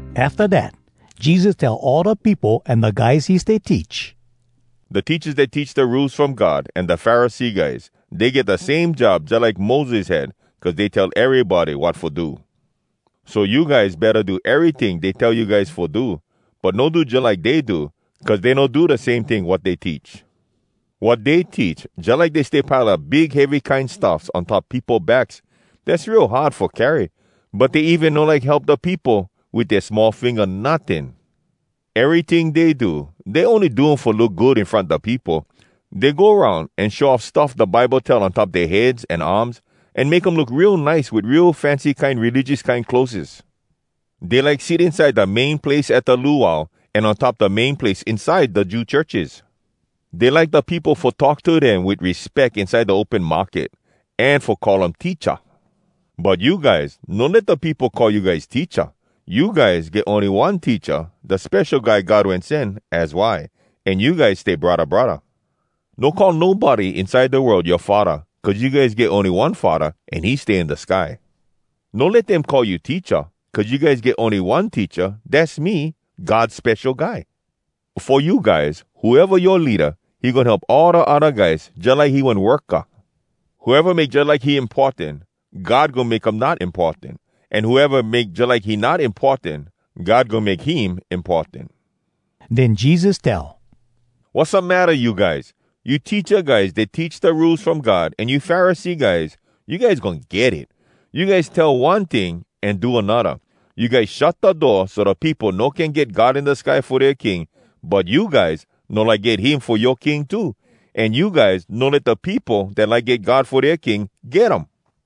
Afta dat Jesus tell all da peopo an da guys he stay teach, “Da teachas dat teach da Rules From God, an da Pharisee guys, dey get da same job jalike Moses had, cuz dey tell erybody wat fo do. So you guys betta do eryting dey tell you guys fo do. But no do jalike dey do. Cuz dey no do da same ting wat dey teach. Wat dey teach, jalike dey stay pile up big heavy kine stuffs on top peopo backs, dass real hard fo carry. But dey even no like help da peopo wit dea small finga notting. Eryting dey do, dey ony do um fo look good in front da peopo. Dey go aroun an show off stuff da Bible tell on top dea heads an arms, an make um look real nice wit real fancy kine religious kine clotheses. Dey like sit inside da main place at da luau, an on top da main place inside da Jew churches. Dey like da peopo fo talk to dem wit respeck inside da open market, an fo call um ‘Teacha.’ “But you guys, no let da peopo call you guys ‘Teacha.’ You guys get ony one Teacha, da Spesho Guy God Wen Sen, az why. An you guys stay braddah braddah. No call nobody inside da world yoa ‘Faddah,’ cuz you guys get ony one Faddah, an he stay in da sky. No let dem call you ‘Teacha,’ cuz you guys get ony one Teacha. Dass me, God Spesho Guy. Fo you guys, whoeva yoa leada, he goin help all da odda guys jalike he one worka. Whoeva make jalike he importan, God goin make um not importan. An whoeva make jalike he not importan, God goin make him importan.” Den Jesus tell, “Wassamatta you guys?! You teacha guys dat teach da Rules From God an you Pharisee guys, you guys goin get it! You guys tell one ting an do anodda. You guys shut da door so da peopo no can get God in da sky fo dea King. But you guys no like get him fo yoa King too. An you guys no let da peopo dat like get God fo dea king, get um.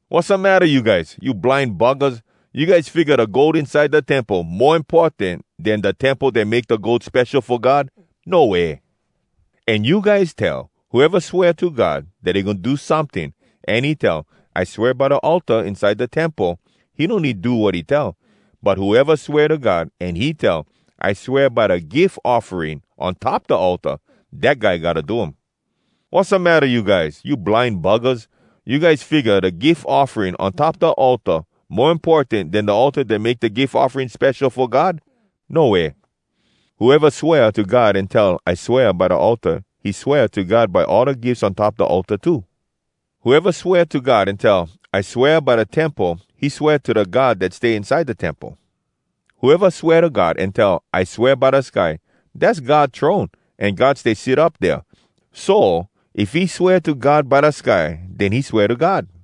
Wassamatta you guys?! You blind buggahs! You guys figga da gold inside da temple mo importan den da temple dat make da gold spesho fo God?! No way! “An you guys tell, ‘Whoeva swea to God dat he goin do someting, an he tell, “I swea by da altar inside da temple,” he no need do wat he tell. But whoeva swea to God, an he tell, “I swea by da gif offering on top da altar,” dat guy gotta do um.’ Wassamatta you guys?! You blind buggahs! You guys figga da gif offering on top da altar mo importan den da altar dat make da gif offering spesho fo God? No way! “Whoeva swea to God an tell, ‘I swea by da altar,’ he swea to God by all da gifs on top da altar too. Whoeva swea to God an tell, ‘I swea by da Temple,’ he swea to da God dat stay inside da Temple. Whoeva swea to God an tell, ‘I swea by da sky,’ dass God throne, an God stay sit up dea. So, if he swea to God ‘by da sky,’ den he swea to God.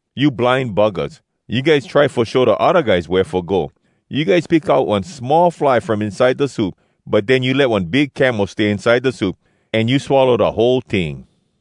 You blind buggahs! You guys try fo show da odda guys wea fo go! You guys pick out one small fly from inside da soup, but den you let one big camel stay inside da soup, an you swallow da whole ting!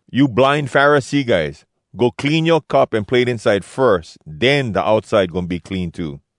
You blind Pharisee guys! Go clean yoa cup an plate inside firs, den da outside goin be clean too.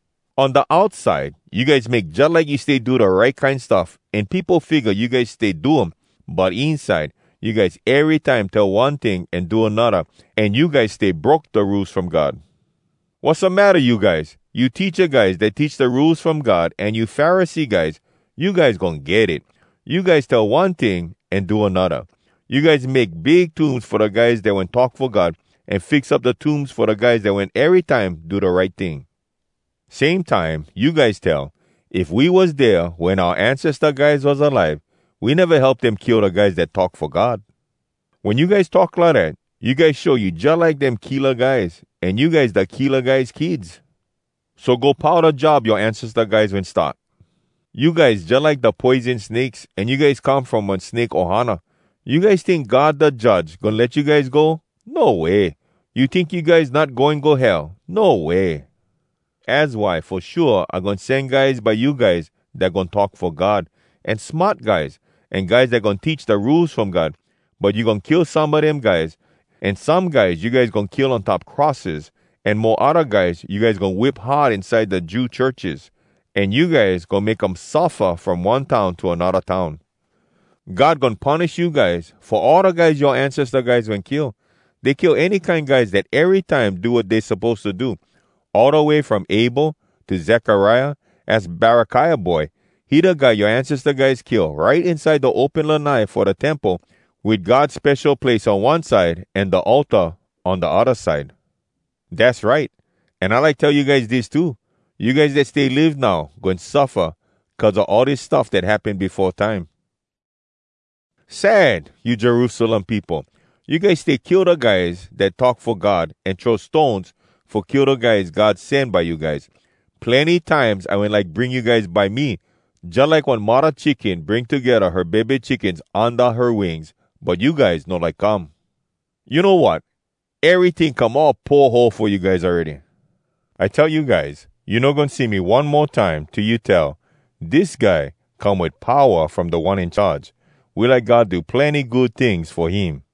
On da outside, you guys make jalike you stay do da right kine stuff, an peopo figga you guys stay do um, but inside, you guys erytime tell one ting an do anodda, an you guys stay broke da Rules From God. “Wassamatta you guys?! You teacha guys dat teach da Rules From God an you Pharisee guys, you guys goin get it! You guys tell one ting an do anodda! You guys make big tombs fo da guys dat wen talk fo God, an fix up da tombs fo da guys dat wen erytime do da right ting. Same time, you guys tell, ‘If we was dea wen oua ancesta guys was alive, we neva help dem kill da guys dat talk fo God.’ Wen you guys talk lidat, you guys show you jalike dem killa guys—an you guys da killa guys kids! So go pau da job yoa ancesta guys wen start! You guys jalike da poison snakes, an you guys come from one snake ohana! You guys tink God da Judge goin let you guys go? No way! You tink you guys not goin go Hell? No way! “Az why fo shua I goin sen guys by you guys dat goin talk fo God, an smart guys, an guys dat goin teach da Rules From God. But you goin kill some a dem guys, an some guys you guys goin kill on top crosses, an mo odda guys you guys goin whip hard inside da Jew churches, an you guys goin make um suffa from one town to anodda town. God goin punish you guys fo all da guys yoa ancesta guys wen kill. Dey kill any kine guys dat erytime do wat dey suppose to do, all da way from Abel to Zekariah, az Barakiah boy. He da guy yoa ancesta guys kill right inside da open lanai fo da temple, wit God spesho place on one side an da altar on da odda side. Dass right! An I like tell you guys dis too: you guys dat stay live now goin suffa, cuz a all dis stuff dat happen befo time. “Sad! You Jerusalem peopo! You guys stay kill da guys dat talk fo God, an throw stones fo kill da guys God sen by you guys. Plenny times I wen like bring you guys by me, jalike one muddah chicken bring togedda her bebe chickens unda her wings, but you guys no like come. You know wat? Eryting come all poho fo you guys awready! I tell you guys, you no goin see me one mo time till you tell, ‘Dis guy come wit powa from Da One In Charge. We like God do plenny good tings fo him!’”